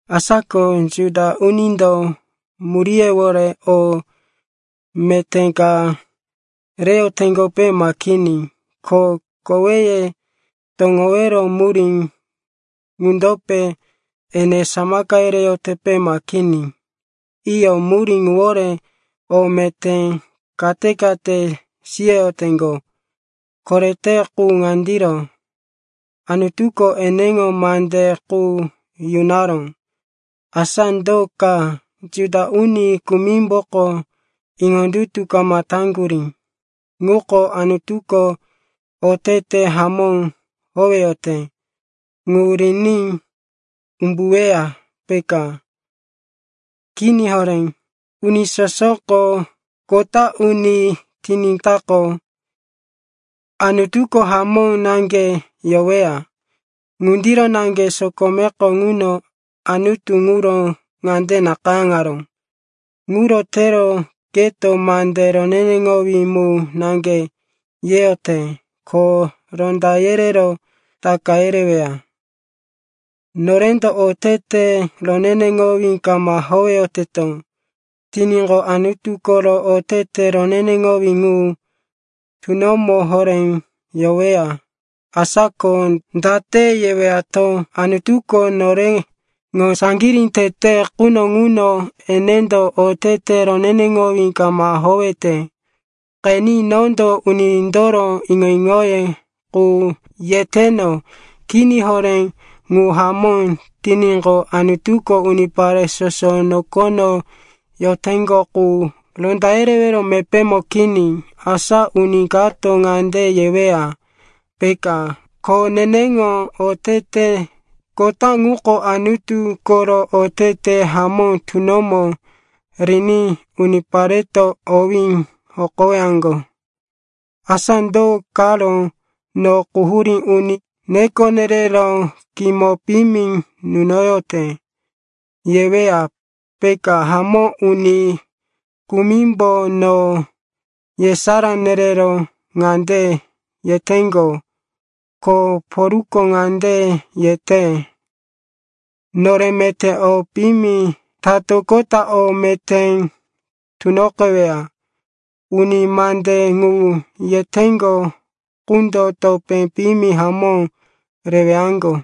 Asa ko Juda unindo muríyewore o meté ka reyoteŋgope ma kini? Ko koweye toŋowero murí ŋundope ene samaka yereyotepe ma kini? Iyo, murí ŋuwore o meté kate-kate siyoyoteŋgo. Korete ŋuko ŋandiro, Anutuko eneŋo mande qu yunaró. Asa do ka? Juda uni kumimboko iŋondutu kama taŋgurí ŋuko Anutuko otete hamó howeyote ŋu riní umbuweya, peka? Kini horé! Uni sosoko kota uni tiníkaqo, Anutuko hamó naŋge yoweya. Ŋundiro naŋge sokomeko ŋuno Anutu ŋuro ŋande nakayáŋaró, “Ŋuro tero keto mande roneneŋowí mu naŋge yeyote, ko ronda yerero taka yereweya.” Norendo otete roneneŋowí kama howeyoteto tiníqo, Anutu koro otete roneneŋowí ŋu tunomo horé yoweya. Asa ko date yewato, Anutuko noreŋo saŋgirí tete quno ŋuno enendo otete roneneŋowí kama howete? (Qeni, nondo unindoro iŋo-iŋoye qu yeteno.) Kini horé! Ŋu hamó tiníqo, Anutuko unipare soso nokono yoteŋgo qu ronda yerewero mepémo kini. Asa uni kato ŋande yeweya, peka, “Ko neneŋo otete kota ŋuko Anutu koro otete hamó tunomo riní unipareto owí hokowaŋgo. Asa do karo no quhurí uni neko nerero kimo piyimi nunoyote?” yeweya, peka. Hamó, uni kumimbo no yesará nerero ŋande yeteŋgo, “Ko Polko ŋande yete, ‘Nore meté o piyimi tatoqota o meté tunoqeweya.’” Uni mande ŋu yeteŋgo qundo topé piyimi hamó rewaŋgo.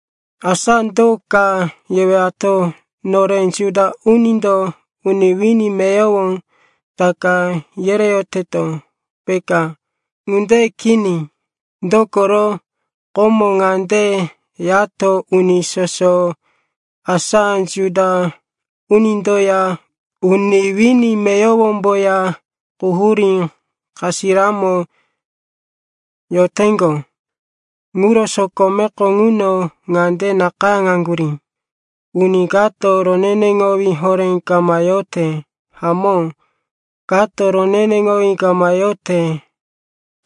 Asa do ka yewato? Nore Juda unindo uni wini meyowo taka yereyoteto, peka? Ŋunde kini. Dokoro komo ŋande yato, uni soso, asa Juda unindoya uni wini meyowomboya, quhurí kasiramo yoteŋgo. Ŋuro sokomeko ŋuno ŋande nakayáŋaŋgurí, “Uni kato roneneŋowí horé kama yote, hamó, kato roneneŋowí kama yote.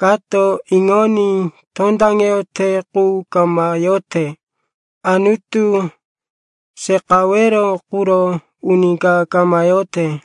Kato iŋoní tondaŋeyote qu kama yote, Anutu seqawero quro uni ka kama yote.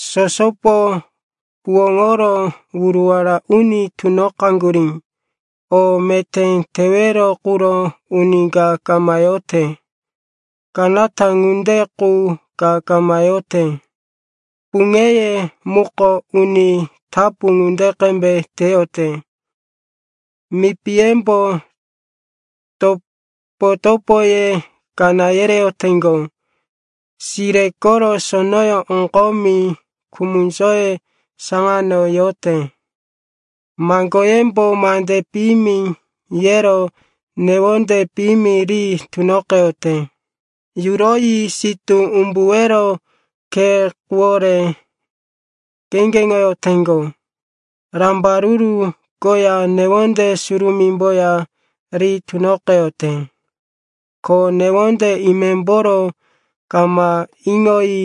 Sosopo huwóŋoro wuruwara uni tunoqaŋgurí, o meté tewero quro uni ka kama yote, kanata ŋunde qu ka kama yote.” “Puŋeye muko uni tapu ŋunde qembe teyote, mipiyembo topo-topoye kaná yereyoteŋgo.” “Sire koro sonoyó oŋgomi kumunzóye saŋano yote.” “Maŋgoyembo mande piyimi yero newonde piyimi ri tunoqeyote.” “Yuroyi sitú umbuwero khe quwore kheŋgeŋoyoteŋgo, rambaruru koya newonde surumímboya ri tunoqeyote, ko newonde imemboro kama iŋoyi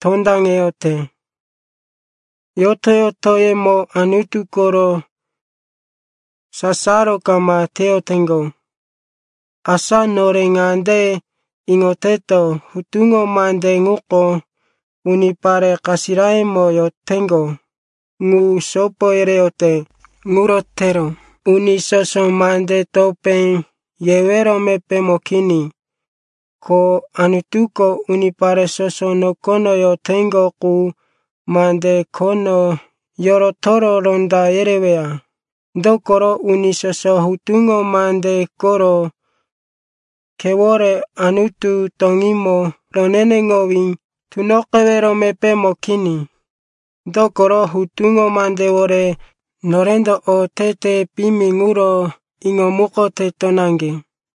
tondaŋeyote.” “Yoto-yotoyemo Anutu koro sasaro kama teyoteŋgo.” Asa nore ŋande iŋoteto, hutuŋo mande ŋuko unipare kasirayómo yoteŋgo ŋu sopo yereyote. Ŋuro tero uni soso mande topé yewero mepémo kini, ko Anutuko unipare soso nokono yoteŋgo qu mande khono yorotoro ronda yereweya. Dokoro uni soso hutuŋo mande koro khewore Anutu toŋímo roneneŋowí tunoqewero mepémo kini. Dokoro hutuŋo mandewore norendo otete piyimi ŋuro iŋomukoteto naŋge.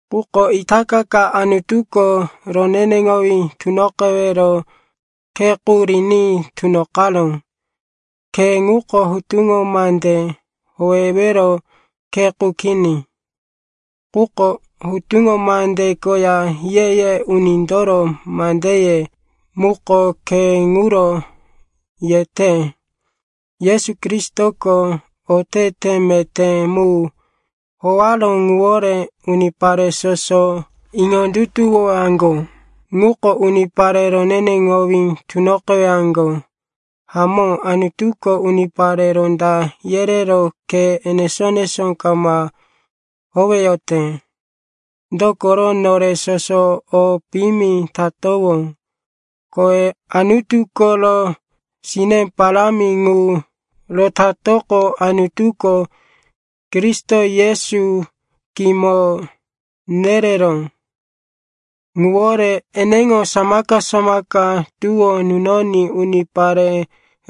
Quko itaka ka Anutuko roneneŋowí tunoqewero khe qu riní tunoqaró. Khe ŋuko hutuŋo mande howewero khe qu kini. Quko Hutuŋo Mande koya Ye-ye Unindoro mandeye muko khe ŋuro yete. Yesu Kristoko otete meté mu howaró ŋuwore unipare soso iŋondutuwowaŋgo ŋuko unipare roneneŋowí tunoqewaŋgo. Hamó, Anutuko unipare ronda yerero khe enesó-enesó kama howeyote, dokoro nore soso o piyimi tatowó. Kowe Anutu koro sine parámi ŋu rotatoqo, Anutuko, Kristo Yesu kimo nereró ŋuwore, eneŋo samaka-samaka tuwó nunoní unipare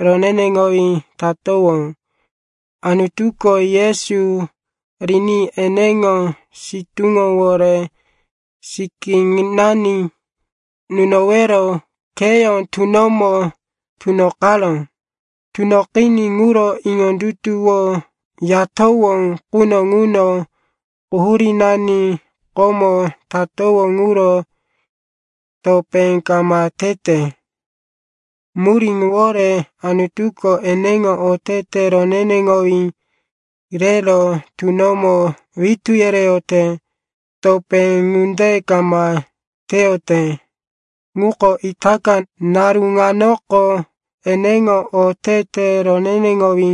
roneneŋowí tatowó. Anutuko Yesu riní eneŋo sitúŋowore sikínani nunowero kheyó tunomo tunoqaró. Tunoqiní ŋuro iŋondutuwoyatowó quno ŋuno quhurínani komo tatowó ŋuro topé kama tete. Murí ŋuwore Anutuko eneŋo otete roneneŋowí rero tunomo witú yereyote. Topé ŋunde kama teyote ŋuko itaka naru ŋanoko eneŋo otete roneneŋowí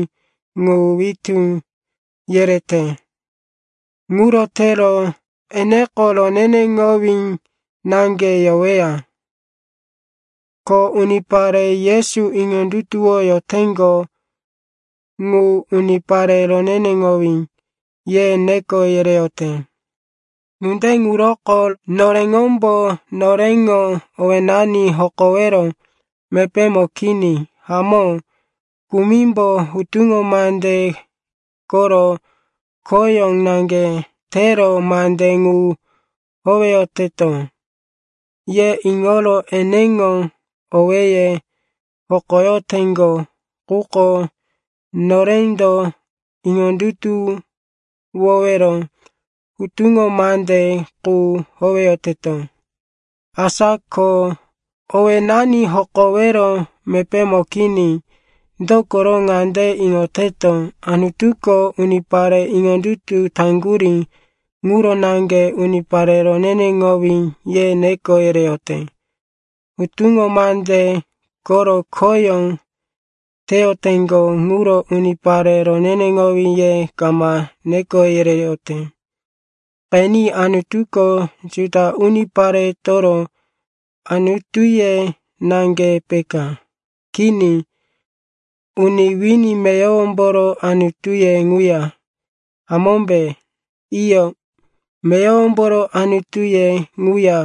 ŋu witú yerete. Ŋuro tero eneko roneneŋowí naŋge yoweya, ko unipare Yesu iŋondutuwoyoteŋgo ŋu, unipare roneneŋowí, ye neko yereyote. Ŋunde ŋuroko noreŋombo noreŋo owénani hokowero mepémo kini. Hamó, kumimbo hutuŋo mande koro khoyó naŋge tero, mande ŋu howeyoteto, ye iŋoro eneŋo owéye hokoyoteŋgo. Quko norendo iŋondutuwowero hutuŋo mande qu howeyoteto. Asa ko owénani hokowero mepémo kini. Dokoro ŋande iŋoteto, Anutuko unipare iŋondutu taŋgurí ŋuro naŋge, unipare roneneŋowí, ye neko yereyote, hutuŋo mande koro khoyó teyoteŋgo ŋuro unipare roneneŋowí ye kama neko yereyote. Qeni, Anutuko Juda uniparetoro Anutuye naŋge peka? Kini, uni wini meyowomboro Anutuye ŋuya, hamómbe? Iyo, meyowomboro Anutuye ŋuya,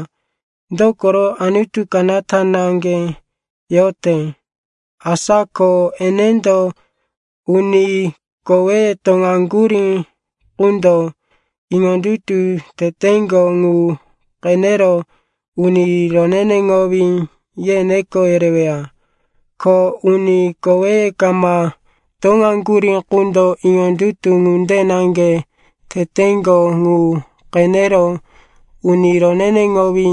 dokoro Anutu kanata naŋge yote. Asa ko enendo uni koweye toŋaŋgurí qundo iŋondutu teteŋgo ŋu qenero, uni roneneŋowí, ye neko yereweya, ko uni koweye kama toŋaŋgurí qundo iŋondutu ŋunde naŋge teteŋgo ŋu qenero, uni roneneŋowí,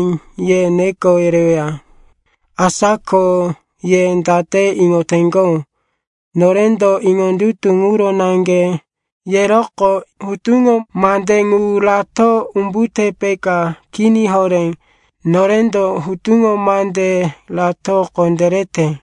ye neko yereweya. Asa ko ye date iŋoteŋgo, norendo iŋondutu ŋuro naŋge yeroqo hutuŋo mande ŋu rato umbute, peka? Kini horé. Norendo hutuŋo mande rato kondérete.